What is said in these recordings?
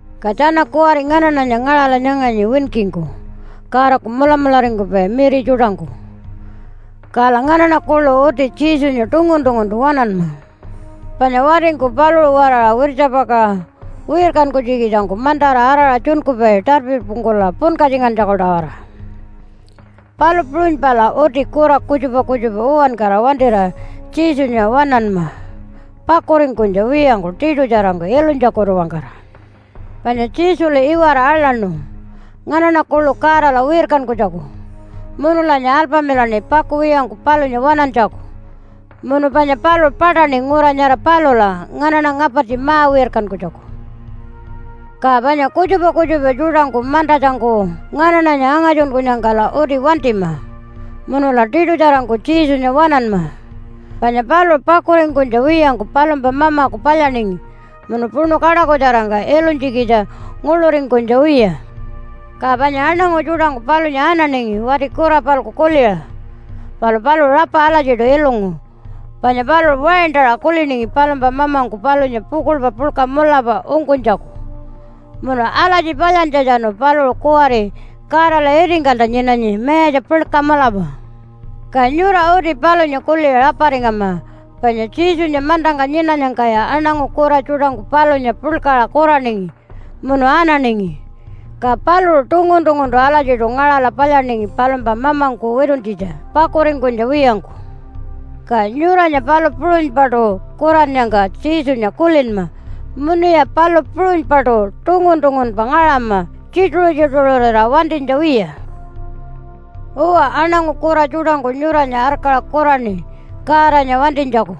Ka tjana kuwari nganaṉanya ngaṟala nyanganyi winkingku Godaku mulamularingkupai miri tjuṯangku. Kala nganaṉa kuḻu uti Jesunya tungun-tunguntu waṉanma. Panya watingku paluṟu-waraṟa wirtjapakaṟa wirkankunytjikitjangku mantara araṟa tjunkupai tarpipungkula punkatjingantjaku-tawara. Palu puṟunypala uti kura kutjupa kutjupa uwankara wantira Jesunya waṉanma pakuringkunytja wiyangku tiṯutjarangku ilunytjakutu-wangkara. Panya Jesulu iwara aḻaṉu nganaṉa kuḻu Godala wirkankunytjaku munulanya alpamilaṉi pakuwiyangku palunya waṉantjaku munu panya paluṟu paṯaṉi ngura nyara palula nganaṉa ngapartji ma-wirkankunytjaku. Ka panya kutjupa kutjupa tjuṯangku mantatjangku nganaṉanya angatjunkunyangkala uti wantima munula tiṯutjarangku Jesunya waṉanma. Panya paluṟu pakuringkunytja wiyangku palumpa Mamaku palyaningi munu puṉu kaṯakutjarangka ilunytjikitja nguḻuringkunytja wiya. Ka panya aṉangu tjuṯangku palunya ananingi wati kura-palku kuliṟa. Palu paluṟu rapa alatjiṯu ilungu panya paluṟu waintaṟa kuliningi palumpa Mamangku palunya pukuḻpa puḻka mulapa ungkunytjaku. Munu alatji palyantjatjanu paluṟu kuwari Godala itingkalta nyinanyi mayatja puḻka mulapa. Ka nyura uti palunya kuliṟa raparingama, panya Jesunya mantangka nyinanyangkaya aṉangu kura tjuṯangku palunya puḻkaṟa kuraningi munu ananingi, ka paluṟu tungun-tunguntu alatjiṯu ngaṟala palyaningi palumpa mamangku wituntjitja pakuringkunytja wiyangku. Ka nyuranya palu puṟunypaṯu kurannyangka Jesunya kulinma, munuya palu puṟunypaṯu tungun-tungunpa ngaṟama tjituṟu-tjituṟurira wantinytja wiya. Uwa, aṉangu kura tjuṯangku nyuranya arkaṟa kuraṉi Godanya wantinytjaku,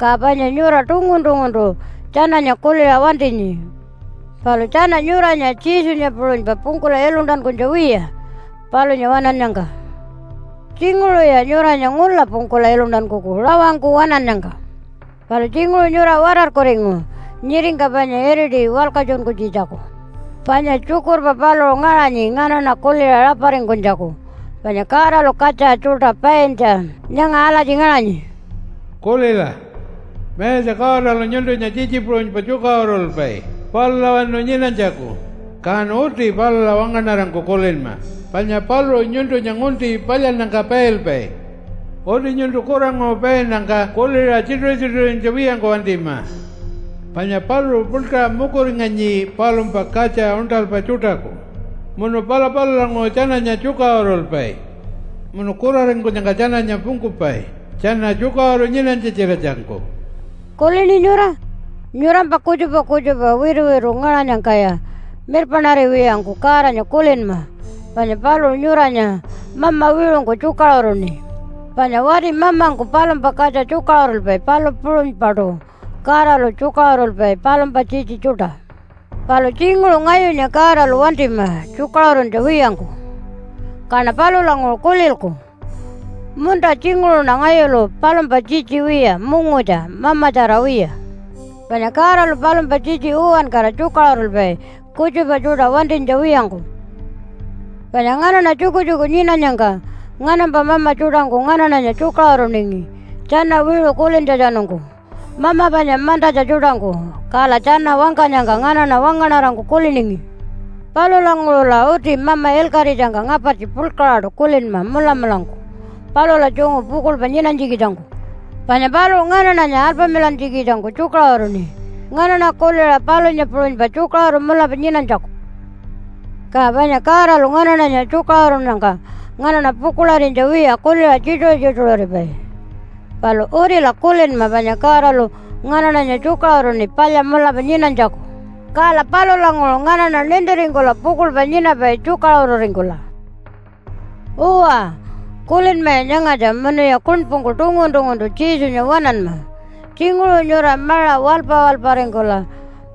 ka panya nyura tungun-tunguntu tjananya kuliṟa wantinyi. Palu tjana nyuranya Jesunya puṟunypa pungkula iluntankunytja wiya palunya waṉannyangka. Tjinguṟuya nyuranya ngula pungkula iluntankuku rawangku waṉannyangka. Palu tjinguṟu nyura watarkuringu nyiringka panya iriti walkatjunkunytjitjaku. Panya tjukurpa paluṟu ngaṟanyi nganaṉa kuliṟa raparingkunytjaku, panya Godalu katja tjuṯa paintja nyanga alatji ngaṟanyi, “Kulila! Mayatja Godalu nyuntunya tjitji puṟunypa tjukaṟurulpai palulawanu nyinanytjaku, kan uti palula wangaṉarangku kulinma panya paluṟu nyuntunya ngunti palyannyangka pailpai. Uti nyuntu kuranguṟu painnyangka kuliṟa tjituṟu-tjituṟurinytja wiyangku wantima. Panya paluṟu puḻkaṟa mukuringanyi palumpa katja uṉṯalpa tjuṯaku, munu pala palulanguṟu tjananya tjukaṟurulpai, munu kuraringkunyangka tjananya pungkupai tjana tjukaṟuru nyinanytja-tjiratjangku.” Kulini nyura? Nyurampa kutjupa kutjupa wituwitu ngaṟanyangkaya mirpaṉariwiyangku Godanya kulinma panya paluṟu nyuranya Mama wiṟungku tjukaṟuruṉi. Panya wati mamangku palumpa katja tjukaṟurulpai, palu puṟunypaṯu Godalu tjukaṟurulpai palumpa tjitji tjuṯa. Palu tjinguṟu ngayunya Godalu wantima tjukaṟuruntja wiyangku, kaṉa palulanguṟu kulilku, “Munta, tjinguṟuṉa ngayulu palumpa tjitji wiya, mungutja, mamatjara wiya.” Panya Godalu palumpa tjitji uwankara tjukaṟurulpai kutjupa tjuṯa wantinytja wiyangku. Panya nganaṉa tjukutjuku nyinanyangka nganampa mama tjuṯangku nganaṉanya tjukaṟuruningi tjana wiṟu kulintjatjanungku mama panya mantatja tjuṯangku. Kala tjana wangkanyangka nganaṉa wangaṉarangku kuliningi. Palulanguṟula uti Mama ilkaṟitjangka ngapartji puḻkaṟaṯu kulinma mulamulangku palula tjungu pukuḻpa nyinanytjikitjangku. Panya paluṟu nganaṉanya alpamilantjikitjangku tjukaṟuruṉi nganaṉa kuliṟa palunya puṟunypa tjukaṟuru mulapa nyinanytjaku. Ka panya Godalu nganaṉanya tjukaṟurunnyangka nganaṉa pukuḻarinytja wiya kuliṟa tjituṟu-tjituṟuripai. Palu utila kulinma panya Godalu nganaṉanya tjukaṟuruṉi palya mulapa nyinanytjaku, kala palulanguṟu nganaṉa nintiringkula pukuḻpa nyinapai tjukaṟururingkula. Uwa, kulinmaya nyangatja munuya kuṉpungku tungun-tunguntu Jesunya waṉanma. Tjinguṟu nyura maṟa waḻpa-waḻparingkula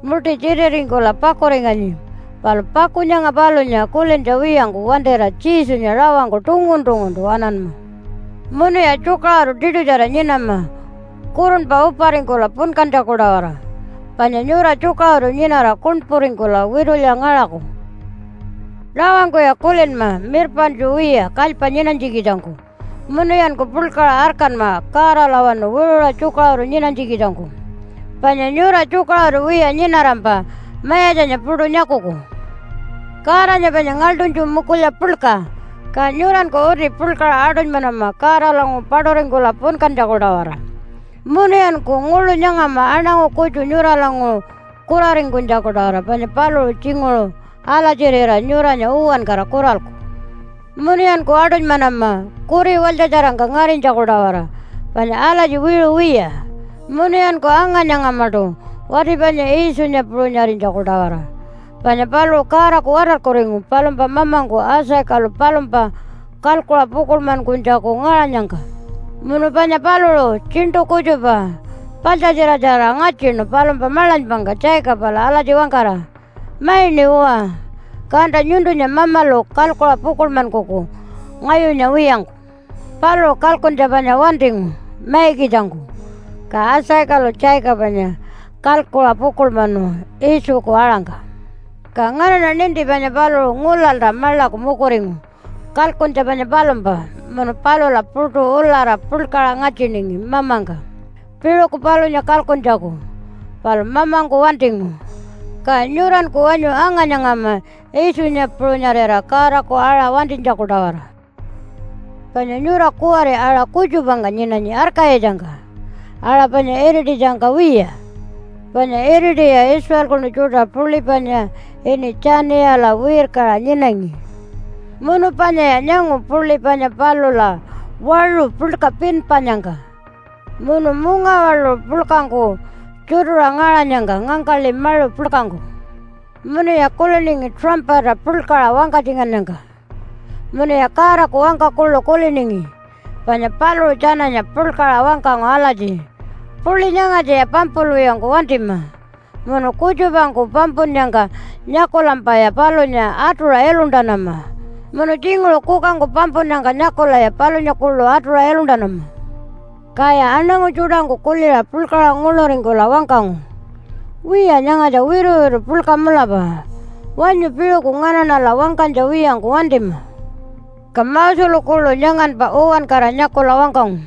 muṯi tjititingkula pakuringanyi, palu paku nyanga palunya kulintja wiyangku wantira Jesunya rawangku tungun-tunguntu waṉanma. Munuya tjukaṟuru tiṯutjara nyinama kurunpa uparingkula punkantjaku-tawara, panya nyura tjukaṟuru nyinara kuṉpuringkula witulya ngaṟaku. Rawangkuya kulinma mirpaṉtju wiya kalypa nyinanytjikitjangku munuyanku puḻkaṟa arkanma Godalawanu wiṟuṟa tjukaṟuru nyinanytjikitjangku. Panya nyura tjukaṟuru wiya nyinarampa Mayatjanya puṯu nyakuku. Godanya panya ngaḻṯunytju mukulya puḻka, ka nyuranku uti puḻkaṟa aṯunymanama Godalanguṟu paṯuringkula punkantjaku-tawara. Munuyanku nguḻu nyangama aṉangu kutju nyuralanguṟu kuraringkunytjaku-tawara, panya paluṟu tjinguṟu alatjirira nyuranya uwankara kuralku. Munuyanku aṯunymanama kuri walytjatjarangka ngarinytjaku-tawara panya alatji wiṟu wiya. Munuyanku anga-nyangamaṯu wati panya Iitjunya puṟunyarinytjaku-tawara panya paluṟu Godaku watarkuringu palumpa mamangku Isaacalu palumpa kalkuṟa pukuḻmankunytjaku ngaṟanyangka, munu panya paluṟu tjiṉṯu kutjupa paḻtjatjiratjarira ngatjinu palumpa maḻanypangka Jacobala alatji wangkara, “Maiṉi uwa, kanta nyuntunya Mamalu kalkuṟa pukuḻmankuku ngayunya wiyangku.” Paluṟu kalkuntja panya wantingu maikitjangku, ka Isaacalu Jacobanya kalkuṟa pukuḻmanu Iitjuku aṟangka. Ka nganaṉa ninti panya paluṟu ngulalta maḻaku mukuringu kalkuntja panya palumpa munu palula puṯu ulara puḻkaṟa ngatjiningi mamangka, piṟuku palunya kalkuntjaku. Palu mamangku wantingu. Ka nyuranku wanyu anga-nyangama Iitjunya puṟunyarira Godaku aṟa wantinytjaku-tawara. Panya nyura kuwari aṟa kutjupangka nyinanyi arkayitjangka, aṟa panya irititjangka wiya. Panya iritiya Israelkunu tjuṯa puḻi panya ini Tjaniyala wirkaṟa nyinangi, munu panyaya nyangu puḻi panya palula waṟu puḻka pinpanyangka, munu mungawaḻuṟu puḻkangku tjutuṟa ngaṟanyangka ngangkaḻi maṟu puḻkangku. Munuya kuliningi tuṟampata puḻkaṟa wangkatjingannyangka. Munuya Godaku wangka kuḻu kuliningi, panya paluṟu tjananya puḻkaṟa wangkangu alatji, “Puḻi nyangatjaya pampulwiyangku wantima. Munu kutjupangku pampunnyangka nyakulampaya palunya atuṟa iluntanama, munu tjinguṟu kukangku pampunnyangka nyakulaya palunya kuḻu atuṟa iluntanama.” Kaya aṉangu tjuṯangku kuliṟa puḻkaṟa nguḻuringkula wangkangu, “Wiya, nyangatja wituwitu puḻka mulapa. Wanyu piṟuku nganaṉala wangkanytja wiyangku wantima.” Ka Moselu kuḻu nyanganpa uwankara nyakula wangkangu,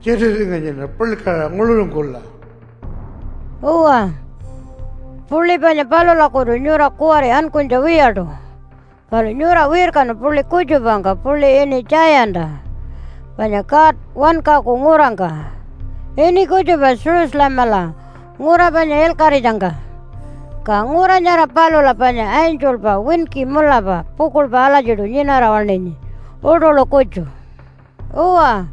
“Tjititinganyiṉa puḻkaṟa nguḻuringkula.” Uwa, puḻi panya palulakutu nyura kuwari ankunytja wiyaṯu, palu nyura wirkanu puḻi kutjupangka puḻi ini Tjayanta, panya God wankaku ngurangka, ini kutjupa Jerusalemala ngura panya ilkaṟitjangka. Ka ngura nyara palula panya angelpa winki mulapa pukuḻpa alatjiṯu nyinara waṉinyi uṯuḻu kutju. Uwa,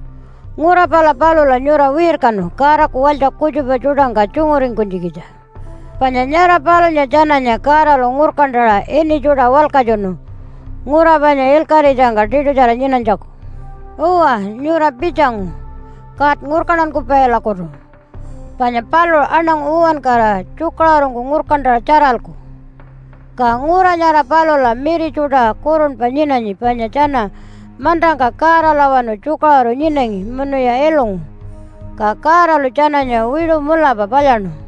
ngura pala palula nyura wirkanu Godaku walytja kutjupa tjuṯangka tjunguringkunytjikitja. Panya nyara palunya tjananya Godalu ngurkantaṟa ini tjuṯa walkatjunu ngura panya ilkaṟitjangka tiṯutjara nyinanytjaku. Uwa, nyura pitjangu God Ngurkantankupailakutu panya paluṟu aṉangu uwankara tjukaṟurungku ngurkantaṟa tjaralku. Ka ngura nyara palula miri tjuṯa kurunpa nyinanyi panya tjana mantangka Godalawanu tjukaṟuru nyinangi munuya ilungu, ka Godalu tjananya wiṟu mulapa palyaṉu.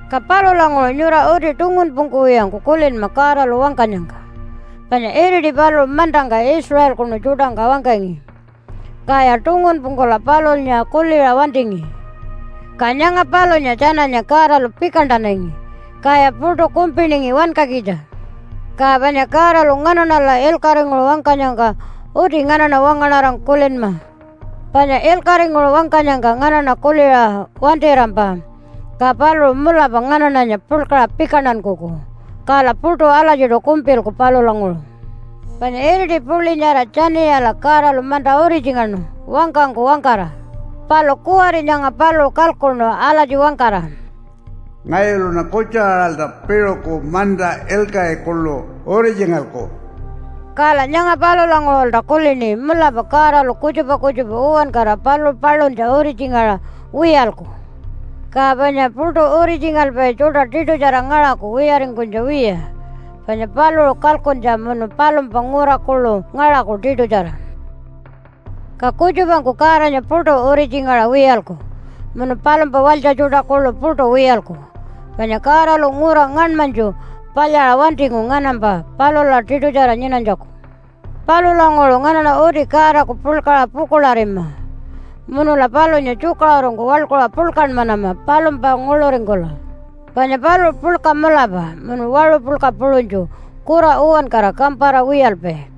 Ka palulanguṟu nyura uti tungunpungkuwiyangku kulinma Godalu wangkanyangka. Panya iriti paluṟu mantangka Israelkunu tjuṯangka wangkangi, kaya tungunpungkula palunya kuliṟa wantingi, ka nyanga palunya tjananya Godalu pikantanangi, kaya puṯu kumpiningi wankakitja. Ka panya Godalu nganaṉala ilkaṟinguṟu wangkanyangka uti nganaṉa wangaṉarangku kulinma. Panya ilkaṟinguṟu wangkanyangka nganaṉa kuliṟa wantirampa, ka paluṟu mulapa nganaṉanya puḻkaṟa pikantankuku, kala puṯu alatjiṯu kumpilku palulanguṟu. Panya iriti puḻi nyara Tjaniyala Godalu manta uritjingaṉu wangkangku wangkara. Palu kuwari nyanga paluṟu kalkuṉu alatji wangkara, “Ngayuluṉa kutju-aṟalta piṟuku manta ilkaṟi kuḻu uritjingalku.” Kala nyanga palulanguṟulta kulini, “Mulapa Godalu kutjupa kutjupa uwankara paluṟu paluntja uritjingaṟa wiyalku. Ka panya puṯu uritjingalpai tjuṯa tiṯutjara ngaṟaku wiyaringkunytja wiya panya paluṟu kalkuntja munu palumpa ngura kuḻu ngaṟaku tiṯutjara.” Ka kutjupangku Godanya puṯu uritjingaṟa wiyalku munu palumpa walytja tjuṯa kuḻu puṯu wiyalku. Panya Godalu ngura ngaṉmanytju palyaṟa wantingu nganampa palula tiṯutjara nyinanytjaku. Palulanguṟu nganaṉa uti Godaku puḻkaṟa pukuḻarima, munula palunya tjukaṟurungku waḻkuṟa puḻkanmanama palumpa nguḻuringkula, panya paluṟu puḻka mulapa munu waṟu puḻka puṟunytju kura uwankara kampara wiyalpai.